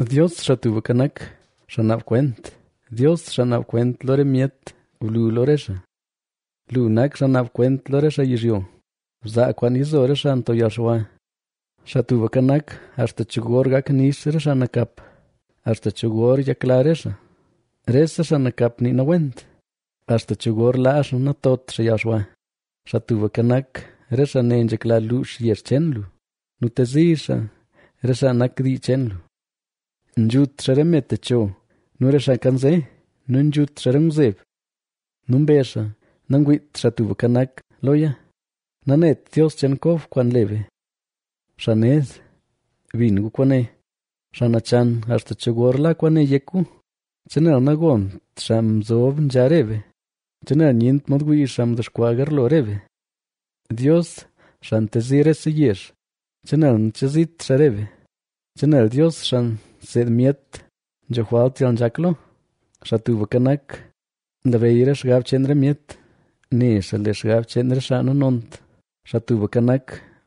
Dios, Xaa Tubka Nak, xaa naab kwent, Dios, xaa naab kwent lo re myet, blu lo re xaa. Lu nak xaa naab kwent lo re xaa yizhyo; bzaa kwaan yizo re xaa nto yalxwa. Xaa Tubka Nak, ¿axta cho gor gak nix re xaa nakap?, ¿axta cho gor nyakla xaa? Rese xaa nakap nii nawent, ¿axta cho gor laa xaa natot xaa yalxwa? Xaa Tubka Nak, re xaa ne nzhekla luux yezh cheen lu nu tezi xaa re xaa nak dii cheen lu. Nzhut xaa re me techo nu re xaa nkanze nu nzhut xaa re ngwzeb. Nu mbezh xaa: “Nangwiit Xaa Tubka Nak loya, nanet Dios cheen Kob kwaan nle be.” Xaa ned, bin gu kwaane, ¿xaa nachan axta cho gor la kwaane yek gu? ¿Chenel nagont xaa mzob nzha re be? ¿Chenel nyent mod wii xaa mdexkwaa garlo re be? Dios, xaa ntezi rese yezh, ¿chenel nachezit xaa re be? ¿chenel Dios xaa nseed myet nzho jwalt yalnzhak lo? Xaa Tubka Nak, nlabeyy re xgab cheen re myet, ne xaa lee xgab cheen re xaa nanont. Xaa Tubka Nak,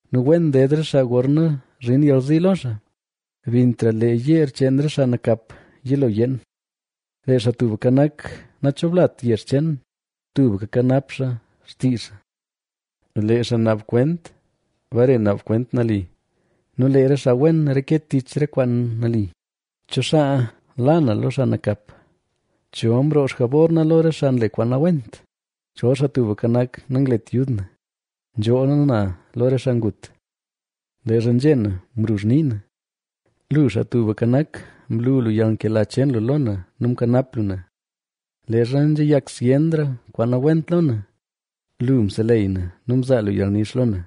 nu wen ded re xaa gorna zhin yalzi lo xaa, bintra lee yeer cheen re xaa nakap yilo yeen. Lee Xaa Tubka Nak, nachoblat yezh cheen; tubka nkanap xaa xtii xaa. Lee xaa naab kwent bare naab kwent nali nu lee re xaa wen reke tich re kwaan nali. ¿Cho xaa la na lo xaa nakap? ¿Cho mroo xjabor na lo re xaa nle kwaan nawent? Chol Xaa Tubka Nak nanglet yud na, nzhoola na lo re xaa ngut. Leezha nzhé na mruzh nii na, lu, Xaa Tubka Nak, mlu lu yalnkela cheen lu lo na nu mkanap lu na. Leezha nzhayak zyenra kwaan nawent lo na, lu mseleyy na nu mzaa lu yalnix lo na.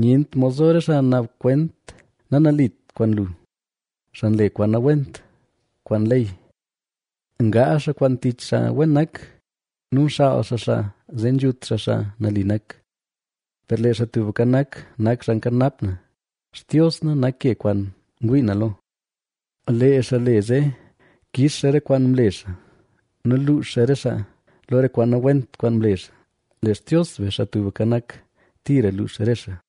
Nyent mod zo re xaa naab kwent nanalit kwaan lu, xaa nle kwaan nawent kwaan ley. Ngaazh xaa kwaan tich xaa wen nak, nu nxaal xaa xaa zee nzhut xaa xaa nali nak. Per lee Xaa Tubka Nak, nak xaa nkanap na, Xtios na nak ke kwaan ngwii na lo. Lee xaa le zee kix xaa re kwaan mle xaa nu luux xaa re xaa, lo re kwaan nawent kwaan mle xaa; lee Xtios be, Xaa Tubka Nak, tira luux re xaa.